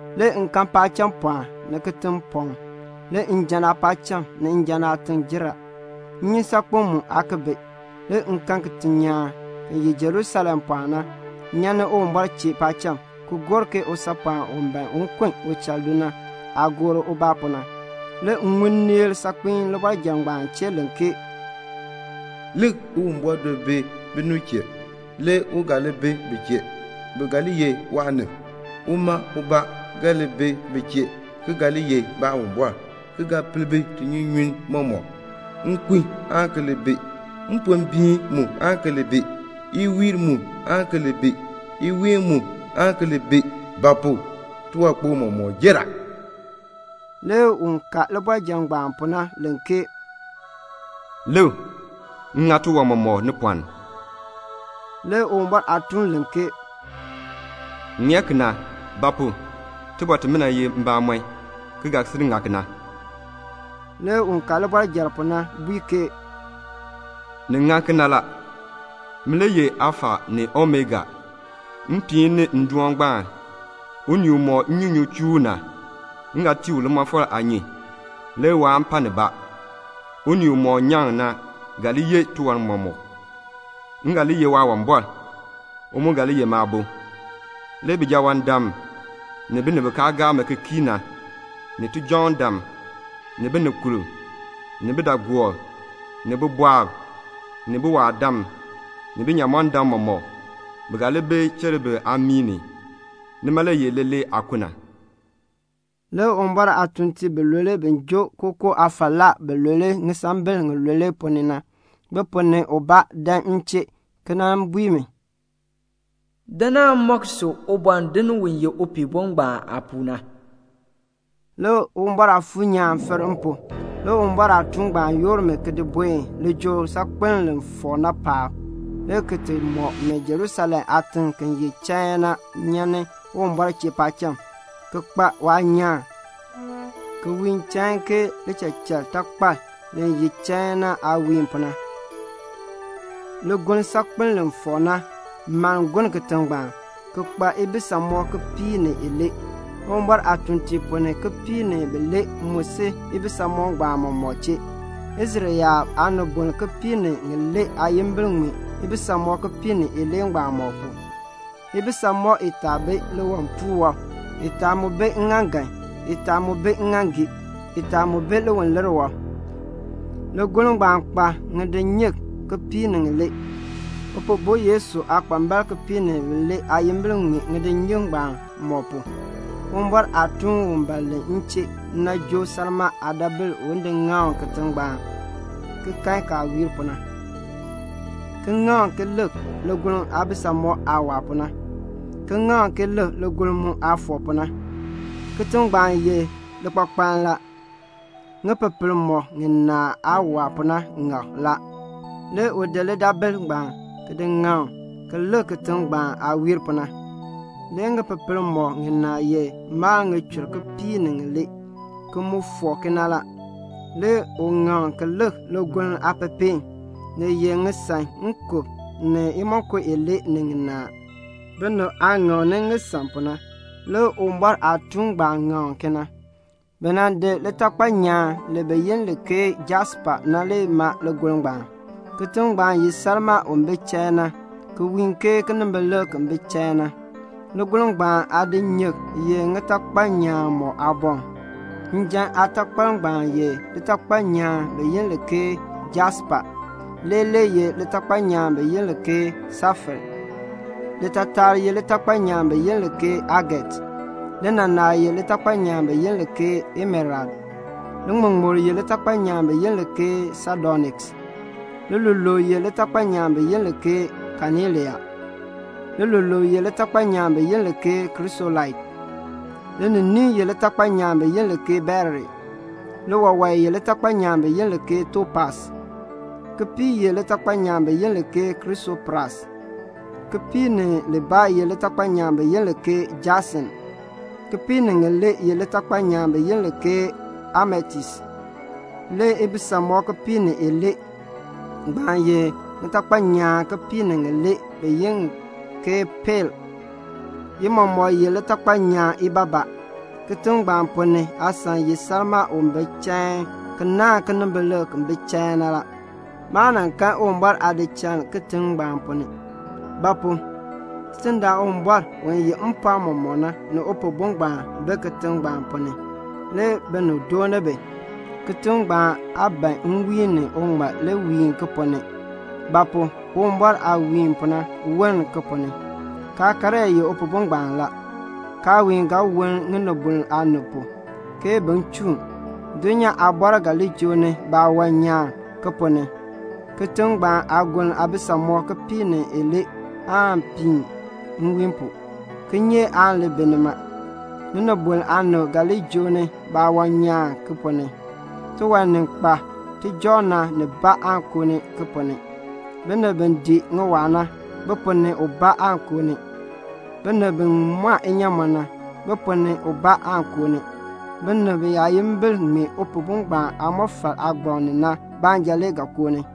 Le m kan paacham pɔɔn, ni kitiŋ pɔɔn; le njan aapaacham, ni njan aatiŋ jer a. Nnyusaakpem mu aa ki bi. Le m kan kitinyaan, ki ye Jerusalem pɔɔn na, nyan ni Uwumbɔr chee paacham, ki gor ke usaapɔɔn u ban un kun uchal do na aah gor ubaa pu na. Le m ŋun nneel saakpiin libɔrjal ngbaan chee len ke "Lik, Uwumbɔr do bi binib chee, le u ga li bi bi chee. Bi ga li ye waanib. Uma ubaa ga li bi bi chee ki ga li ye Baawumbɔr, ki ga per bi tinyunyunn mɔmɔk. Nkun aan ki li bi; mpombiin mu aan ki li bi; iwiil mu aan ki li bi; iween mu aan ki li bi; ba pu? tiwankpok mɔmɔk jer a." Le un ka libɔrjal ngbaan pu na len ke "Lik, m ŋa tiwan mɔmɔk ni pɔɔn." Le Uwumbɔr aatuun len ke "Ŋmee kena; ba pu? iliin imina ye mbamɔn, ki ga sil ŋa kena." Le un ka libɔrjal pu na bui mi, "Ni ŋa kena la. Min le ye Alfa ni Omega, mpiin ngbaan ni ndoon ngbaan. Unii umɔk nnyunyun chuu u na, m ga tii u limɔfal aanyun, le waan pa nibaa. Unii umɔk nyaŋ na ga li yeh tiwan mɔmɔk. M ga li ye Waawumbɔr; u mu ga li ye maabo. Le bijawaandam, ni binib bi kaa gaa mi ki kii na, ni tijɔŋdam, ni binikurb, ni bidaagoob, ni bibɔɔb, ni biwaadam, ni binyamɔndam mɔmɔk, bi ga li bi cheribir aamii ni. Nima le ye leelee aakun." Le Uwumbɔr aatuuntiib bilule bi joo kookoo aafalaa bilule ŋisambil ŋilule ponn ni na, bi ponn ni ubaa dan m chee ki bui mi, "Dan m nan mɔk si Ubɔndinn u ye Upihbo ngbaan aapuu na." Le Uwumbɔr Aafuur nyaan fir m pu. Le Uwumbɔr aatuun ngbaan yoor mi ki di buen lijool saakpeln li fɔk na paab, le ki mɔk mi Jerusalem aatiŋ ki ye chain na nyan ni Uwumbɔr chee paacham, ki kpa waanyaan, ki wiin chain ke lichachatakpal li ye chain na aah wiin pu na. Ligoln saakpeln li fɔk na mann gonn kitiŋ ngbaan, ki kpa ibisamɔb kipiik ni ilee. Uwumbɔr aatuuntiib ponn ni kipiik ni bilee mu si ibisamɔb ngbaan mɔmɔk chee. Israel yaab aanibol kipiik ni ŋilee aayimbil ŋmee ibisamɔb kipiik ni ilee ngbaan mɔk pu. Ibisamɔb itaa bi liwipuul wɔb, itaa mu bi ŋŋaaŋgan, itaa mu bi ŋŋaaŋgii, itaa mu bi liwilir wɔb. Ligoln ngbaan kpa ŋidinyik kipiik ni ŋilee. Upihbo Yesu aakpambalb kipiik ni bilee aayimbil ŋmee ŋidinyik ngbaan mɔk pu. Uwumbɔr aatuun u len m chee na joo salmaa aadaabil un ti ŋaŋ ki lik kitiŋ ngbaan aah wiir pu na, ki ŋaŋ ki lik ligoln aabisamɔb aah waa pu na, ki ŋaŋ ki lik ligoln mu aah fɔk pu na. Kitiŋ ngbaan ye likpakpann la. Ŋipepel mɔk ŋinaa aah waa pu na, ni ŋak la. Le u di lidaabil ngbaan ki ŋaŋ ki lik kitiŋ ngbaan aah wiir pu na. Le ŋipepel mɔk ŋinaa ye mal ŋichur kipiik ni ŋilee, ki mu fɔk kena la. Le u ŋaŋ ki lik ligoln aapepeen. Ni ye ŋisaŋ nkub ni imonko ilee ni ŋinaa, binib aah ŋaŋni ŋisaŋ pu na; le Uwumbɔr aatuun ngbaan ŋaŋ kena. Bi nan di litakpal nyaan bi yi li ke jaspa na, ki maa ligoln ngbaan. Kitiŋ ngbaan ye salmaa u bi chain na, ki wiin ke kinimbilik ki bi chain na. Ligoln ngbaan aadinyik ye ŋitakpal nyaan mɔk aaboŋ. Njan aatakpal ngbaan ye litakpal nyaan bi yi li ke jaspa, lileeler ye litakpal nyaan bi yi li ke safair, litaatar ye litakpal nyaan bi yi li ke aget, linaanar ye litakpal nyaan bi yi li ke emerald, liŋmuŋmur ye litakpal nyaan bi yi li ke sadoniks, liluluub ye litakpal nyaan bi yi li ke kanelian, lilulule ye litakpal nyaan bi yi li ke krisolait, lininiin ye litakpal nyaan bi yi li ke beril, liwewae ye litakpal nyaan bi yi li ke topas, kipiik ye litakpal nyaan bi yi li ke krisopras, kipiik ni libaa ye litakpal nyaan bi yi li ke jasint, kipiik ni ŋilee ye litakpal nyaan bi yi li ke ametist. Le ibisamɔb kipiik ni ilee ngbaan ye ŋitakpal nyaan kipiik ni ŋilee bi yi li ke pael; i mɔmɔk ye litakpal nyaan ibaabaa. Kitiŋ ngbaan ponn ni aasan ye salmaa u bi chain ki naahn kinimbilik ki bi chain na. Maa kan Uwumbɔr aadichal kitiŋ ngbaan ponn ni; ba pu? Tidindaan Uwumbɔr u yeh mpɔɔn mɔmɔk na, ni Upihbo ngbaan bi kitiŋ ngbaan ponn ni, le binib dooni bi. Kitiŋ ngbaan aa ban nwiin ni uŋmal li wiin ki ponn ni; ba pu? Uwumbɔr aah wiin pu na woln ki ponn ni. Kaakaryaa ye Upihbo ngbaan la. Kaawiin ga woln ŋinibol aanib pu, ke bin chuun. Dulnyaa aabɔrb ga li joo ni baawan nyaan ki ponn ni. Kitiŋ ngbaan aagoln aabisamɔb kipiik ni ilee aan piin nwiin pu. Kinyeek aan li bi nima. Ŋinibol aanib ga li joo ni baawan nyaan ki ponn ni. Tiwan ni kpa tijɔŋ na nibaa aan koo ki ponn ni. Binib bi dii ŋiwaa na, bi ponn ni ubaa aan koo ni. Binib bi mɔn inyaamɔn na, bi ponn ni ubaa aan koo ni. Binib biyaayimbil ŋmee Upihbo ngbaan aamɔfal aagbaŋ pu na baanja le ga koo ni.